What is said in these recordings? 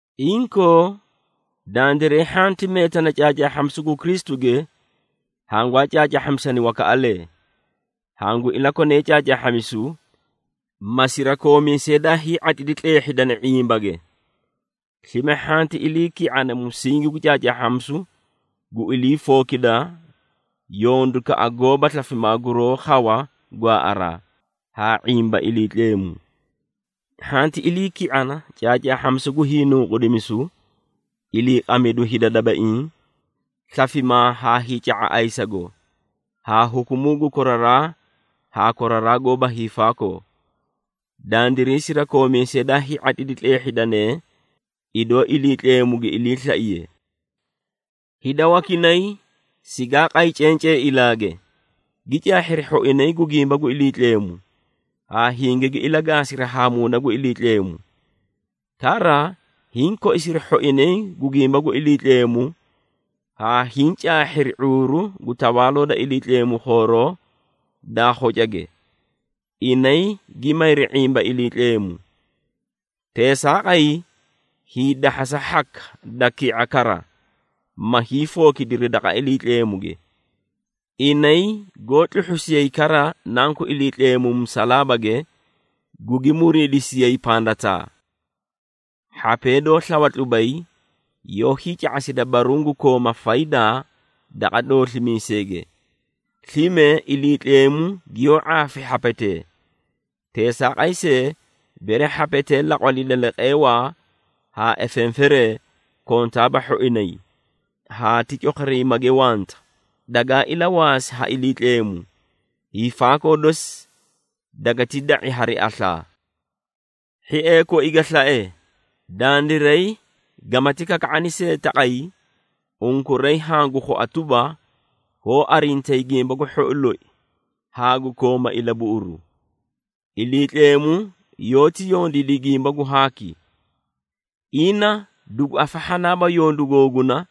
Inkoo, dandiray hhanti meetana caacaahhamisu gu Kristuge, hangwaa caacaahhamisani wakaꞌalee. Hangu ilakone caacaahhamisu, ma sirakoomiisee daa hii⁄atlidi tleehhidani ⁄imbage. Slime, hhanti iliiki⁄ana musingi gu caacaahhamisu gu ilii fookida yondukaꞌa goóba slafimaa guroó khawa gwaaꞌaraa, haa ⁄imba Iliitleemu. Hhanti iliiki⁄ana caacaahhamisu gu hiinunqudimisu, iliiqamidu hida dabaiĩ, slafimaa haa hiica⁄a ayisago, haa hukumuu gu koraraa haa koraraa goóba hiifaakoo. Dandiray sirakoomiisee daa hii⁄atlidi tleehhidane, idoo Iliitleemu gi iliislaiye. Hida wakinay sigaa qay cencee ilaage, gi caahhiri hhoinay gu gimba gu Iliitleemu, haa hingigi ilagaasiri haa Muuna gu Iliitleemu. Kara hiĩ koisiri hhoinay gu gimba gu Iliitleemu haa hiĩ caahhiri ⁄uuru gu Tawaaloo da Iliitleemu khooroo daa khocage, inay gi mayri ⁄imba Iliitleemu. Teesaaqay, hiidahhasa hhaka da ki⁄a kara, ma hiifookidiri daqa Iliitleemuge. Inay goó tluhhusiyay kara Nanku Iliitleemu musalaabage, gugi muriidisiyay pandataa. Hhapee doó slawa tlubay, yoó hiica⁄asida baruũ gu kooma faydaa daqa dooslimiiseege, slime Iliitleemu giyoó ⁄aafi hhapetee. Teesaaqay see, bere hhapetee laqwalida leqeewaa haa efenferee, kontaaba hhoinay, haa ti cokhoriimage wanta dagaa ilawaasi ha Iliitleemu. Hiifaakoo dosi dagati da⁄i hari aslaa. Hhiee koi ga slae, dandiray gamati kakaakani see taqay, unkuray hangu khua tuba, hoó arintayi gimba gu hhou loi, haa gu kooma ilabuꞌuru. Iliitleemu yoóti yondiidi gimba gu haaki. Ina dugu afahhanaaba yondu googuna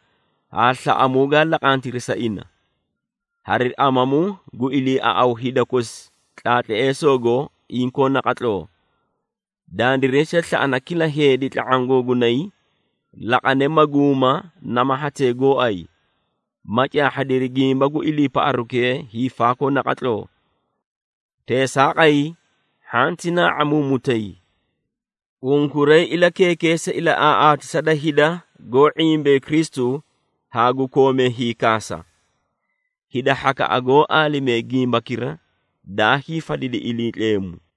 haa slaꞌamuu gaa laqantiri sa ina, hari amamu gu iliiaꞌaw hida kosi tlaatleesoogo inkoo naqatloo. Dandiray see slaꞌana kila heedi tla⁄aã googunay, laqane maguuma nama hatee gooay, ma caahhadiri gimba gu iliipaꞌarukee hiifaakoo naqatloo. Teesaaqay, hhanti naa⁄amuumutay. Unkuray ilakeekeesa ilaꞌaaꞌaatisa da hida goó ⁄imba Kristu haa gu koomee hiikaasa. Hida hhakaꞌa goó aalimee gimbakira daa hiifadidi Iliitleemu.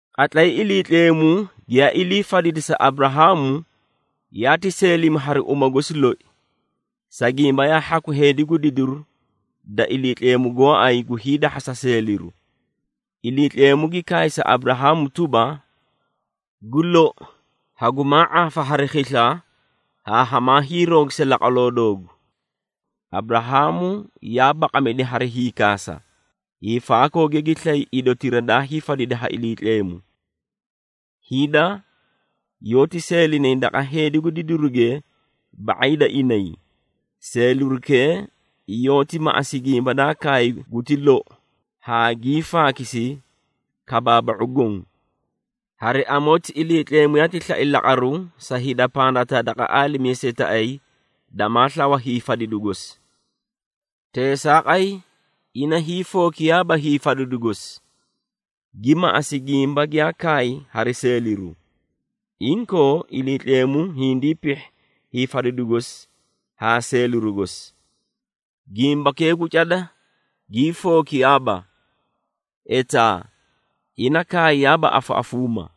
Qatlay Iliitleemu giyaa ilii fadidi sa Aburahaamu, yaati seelimi hari uma gosi loi, sa gimba yaa hhaku heedi gu didiru da Iliitleemu gooay gu hiidahhasa seeliru. Iliitleemu gi kaay sa Aburahaamu tuba, “Gu lou hagumaa ⁄aafa hari khisla haa hamaa hiiroogisa laqwaloo doogu.” Aburahaamu yaa baqamidi hari hiikaasa, hiifaakooge gi slay idotira daa hiifadidi ha Iliitleemu. Hida yoóti seelinay daqa heedi gu didiruge ba⁄ay da inay, seelirukee yoóti maꞌasi gimba daa kaay guti lou haa gii faakisi kabaaba⁄u goõ. Hari amoti, Iliitleemu yaati slai laqaru sa hida pandataa daqa aalimiisetaꞌayi damaa slawa hiifadidu gosi. Teesaaqay, ina hiifookiyaaba hiifadidu gosi, gi maꞌasi gimba giyaa kaay hari seeliru. Inkoo, Iliitleemu hindii pihhi hiifadidu gosi haa seeliru gosi. Gimbakee gu cada gii fookiyaaba. Etaa, ina kaayaaba afaꞌafuuma.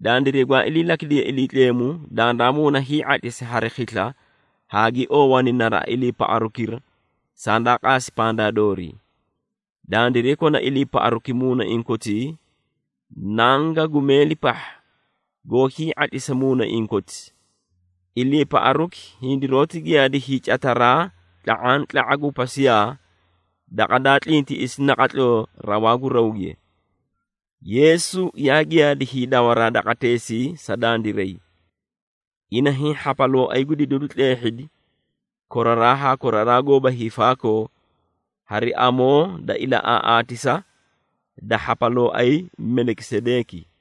Dandiray gwaa iliilakidee Iliitleemu, dandaa muuna hii⁄atlisi hari khisla haa gi oowani naraꞌa iliipaꞌarukira sandaa qaasi pandaa doorii. Dandiray kona iliipaꞌaruki muunaiĩ kotii nanga gu meeli pahha goó hii⁄atlisa muunaiĩ koti. Iliipaꞌaruki hindiroóti giyaadi hiicataraa tla⁄antla⁄aã gu pasiyaa, daqa daa tlintiꞌisi naqatloo rawaa gu rawge. Yeesu yaa giyaadi hiidawa daqateesii sa dandiray. Ina hiĩ hhapalooay gu didiru tleehhidi koraraa haa koraraa goóba hiifaakoo hari amoo da ilaꞌaaꞌaatisa da hhapalooay Melikisedeeki.